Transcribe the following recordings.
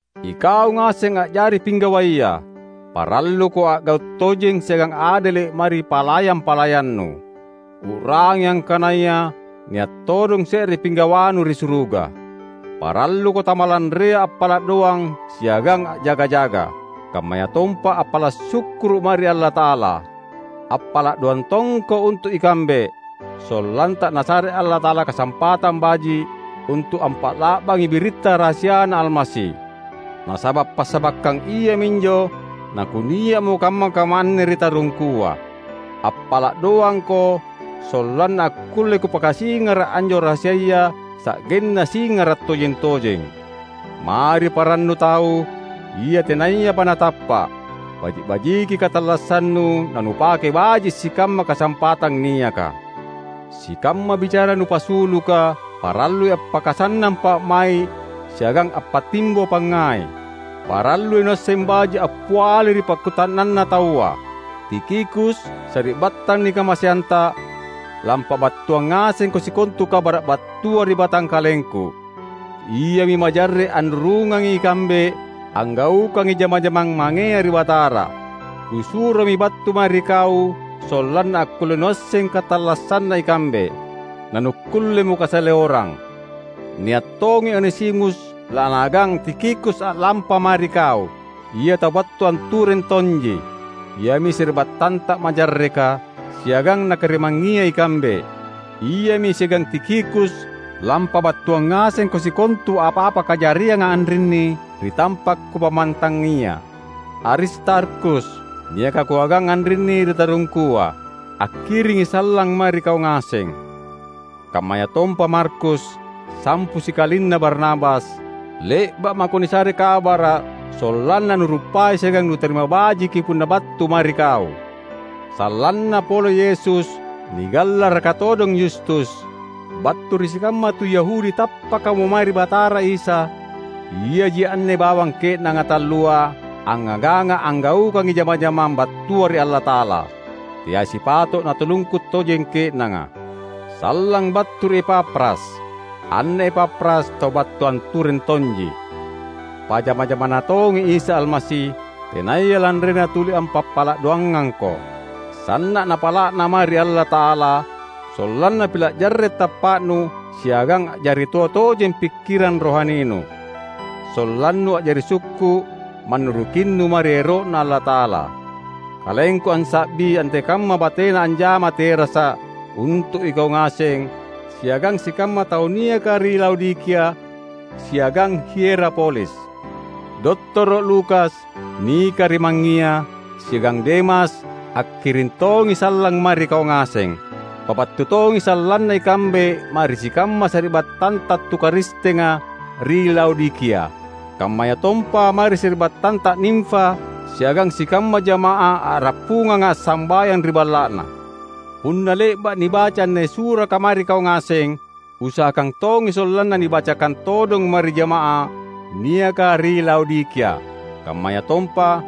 Ikau ngaseng a’jari pinggawaya! Paralluko a’gau’ tojeng siagang adele’ mae ri palayang-palayannu. U’rangi angkanaya nia’ todong se’re pinggawanu ri suruga. Paralluko tamalanrea appala’ doang siagang a’jaga-jaga, kammayatompa appala’ sukkuru’ mae ri Allata’ala. Appala’ doang tongko untu’ ikambe, sollanta Nasare Allata’ala kasampatang baji’, untu’ ampa’la’bangi biritta rahasiaNa Almasi. Nasaba’ passabakkang iaminjo nakunia’mo kamma-kamma anne ri tarungkua. Appala’ doangko sollanna akkulle kupakasingara’ anjo rahasiaya sa’genna singara’ tojeng-tojeng. Mae ri parannu tau, ia tenayapa natappa’, baji’-bajiki katallassannu nanupake baji’ sikamma kasampatang niaka. Sikamma bicara nupasuluka parallui appakasannang pa’mai’ siagang appatimbo pangngai. Parallui nuasseng baji’ appiali ri pakkuta’nanna taua. Tikhikus, sari’battang nikamaseanta, lampabattuang ngasengko sikontu kabara’ battua ri batangkalengku. Iami majarre’ anrurungangi ikambe anggaukangi jama-jamang mangea ri Batara. Kusuromi battu mae ri kau sollanna akkulle nuasseng katallassanna ikambe, nanukkullemo kasaleorang. Nia’ tongi Onesimus lanaagang Tikhikus a’lampa mae ri kau; Ia tau battu antureng tonji. Iami sari’battanta majarreka, siagang nakarimangngia ikambe. Iami siagang Tikhikus lampabattuang ngasengko sikontu apa-apa kajarianga anrinni ri tampa’ kupammantangia. Aristarkhus, niaka kuagang anrinni ri tarungkua, akkiringi sallang mae ri kau ngaseng. Kammayatompa Markus, sampu sikalinna Barnabas. (Le’ba’ mako nisare kabara’ sollanna nuruppai siagang nutarima bajiki punna battu mae ri kau.) Sallanna pole Yesus nigallaraka todong Yustus. Battu ri sikamma tu Yahudi tappakamo mae ri Batara Isa, iaji anne bawang ke’nanga tallua angngaganga’ anggaukangi jama-jamang battua ri Allata’ala. Teai sipato’ natulungku tojeng ke’nanga. Sallang battu ri Epafras. Anne Epafras tau battu antureng tonji. Pajama-jamaNa tongi Isa Almasi, tenaya lanrena tuli ampappala’ doangangko. Sanna’ napala’na mae ri Allata’ala, sollanna pila’ jarre’ tappa’nu siagang a’jari toa tojeng pikkirang rohaninu; sollannu a’jari sukku’ mannurukinnu mae ri ero’Na Allata’ala. Kalengku ansa’bi antekamma batena anjama terasa’ untu’ ikau ngaseng siagang sikamma tau niaka ri Laodikia siagang Hierapolis. Dottoro’ Lukas, nikarimangngia, siagang Demas, akkiring tongi sallang mae ri kau ngaseng. Pabattu tongi sallanna ikambe mae ri sikamma sari’battanta tu Karistenga ri Laodikia; kammayatompa mae ri sari’battanta Nimfa siagang sikamma jama’ah a’rappunganga assambayang ri balla’na. Punna le’ba’ nibaca anne suraka mae ri kau ngaseng, usahakang tongi sollanna nibacakang todong mae ri jama’ah niaka ri Laodikia. Kammayatompa,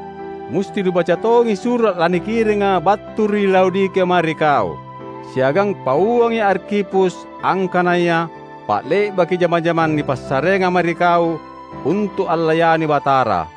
musti nubaca tongi sura’ lanikiringa battu ri Laodikia mae ri kau. Siagang pauangi Arkhipus, angkanaya, "Pa’le’baki jama-jamang nipassareanga mae ri kau untu’ allayani Batara."